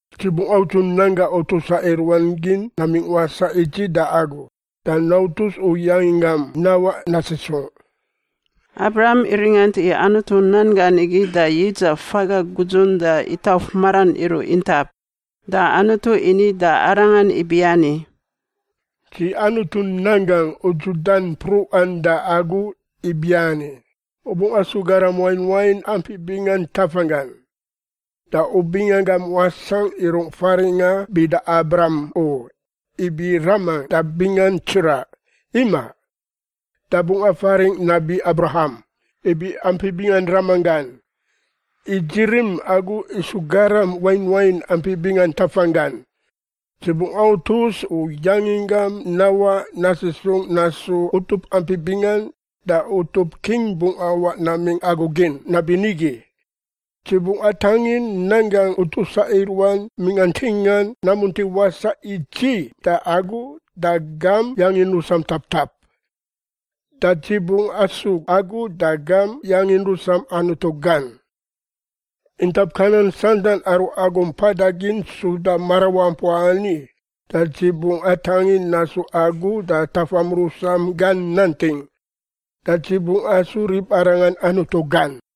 Dzi bungꞌ audzu nan gangꞌ utusa i ruan gin namingꞌ wasaꞌ i dzi da agu da nautus u yanginggam nawaꞌ nasisungꞌ.” Abram iringant i Anutu nan gan igi da yidzaꞌ faga gudzun da itauf maran iruꞌ intap, da Anutu ini da arangan ibiani, “Dzi Anutu nan gangꞌ udzudan mpruꞌan da agu ibiani, u bungꞌ asu garam wain wain ampi bingan tafanggan. Da u bingangam wasangꞌ i rungꞌ faringꞌa bida Abram u (ibi ‘raman da bingan tsiraꞌ’), imaꞌ. Da bungꞌ afaringꞌ nabi Abraham (ibi ‘ampi bingan ramanggan’), i dzi rim agu isu garam wain wain ampi bingan tafanggan. Dzi bungꞌ autus u yanginggam nawaꞌ nasisung nasu utup ampi bingan da utup king bungꞌ awaꞌ namingꞌ agu gin nabinigi. Dzi bungꞌ atangin nan gangꞌ utusa i ruan mingꞌa ntingan namunti wasaꞌ i dzi da agu da gam yangin rusam taptap. Da dzi bungꞌ asu agu da gam yangin rusam Anutu gan. Intap Kanan santan aru agu mpada gin suda marawampua ani da dzi bungꞌ atangin nasu agu da tafam rusam gan nanting, da dzi bungꞌ asu ribarangan Anutu gan.”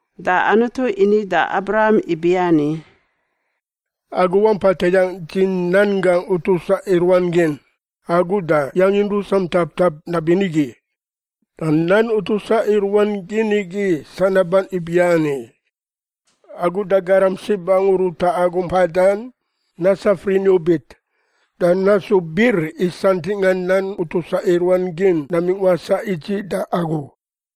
Da Anutu ini da Abraham ibiani, “Agu wampa tayangꞌ dzi nan gangꞌ utusa i ruan gin, agu da yangin rusam taptap nabinigi. Da nan utusa i ruan gin igi sanaban ibiani: Agu da garam sib angu ruta agu mpadan nasaf riniubit, da nasu bir i santingꞌa nan utusa i ruan gin namingꞌ wasaꞌ i dzi da agu.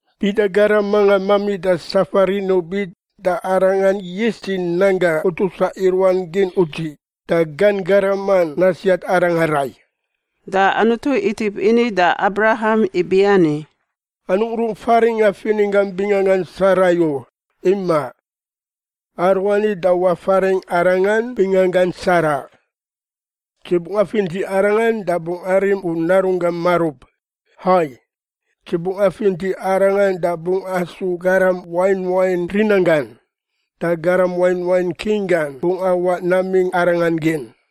Bida garam mangan mamida safa riniubit da arangan yis dzi nan gangꞌ utusa i ruan gin udziꞌ da gan garaman nasiat arangan rai.” Da Anutu itip ini da Abraham ibiani, “Anungꞌ rungꞌ faringꞌa fininggam binganggan Sarai u. Imaꞌ. Aruani da wafaringꞌ arangan binganggan Sara. Dzi bungꞌ afinti arangan da bungꞌ arim u narunggam marub. Hai, dzi bungꞌ afinti arangan da bungꞌ asu garam wain wain rinanggan, da garam wain wain king gan bungꞌ awaꞌ namingꞌ arangan gin.”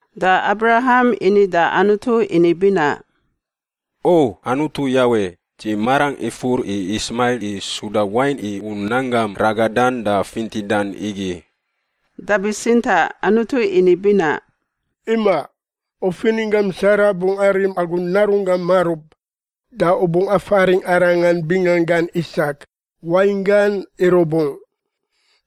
Da Abraham ini da Anutu ini binaꞌ, “O Anutu Yawe, dzi marangꞌ ifur i Ismail i suda wain i u nan gam ragadan da fintidan igi.” Da bitsintaꞌ Anutu ini binaꞌ, “Imaꞌ. U fininggam Sara bungꞌ arim agu narunggam marub, da u bungꞌ afaringꞌ arangan binganggan Isak (wainggan ‘irubungꞌ’).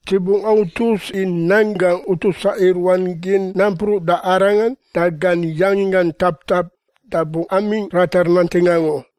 Dzi bungꞌ autus i nan gangꞌ utusa i ruan gin nampruꞌ da arangan da gan yanginggan taptap da bungꞌ amingꞌ ratar nanting angu.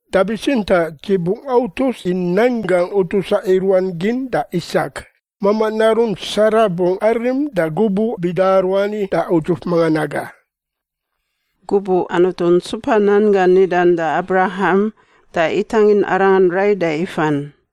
Da bitsintaꞌ dzi bungꞌ autus i nan gangꞌ utusa i ruan gin da Isak, mamaꞌ narun Sara bungꞌ arim da gubuꞌ bida aruani da udzuf mangan aga.” Gubuꞌ Anutu ntsupa nan gan nidan da Abraham, da itangin arangan rai da ifan.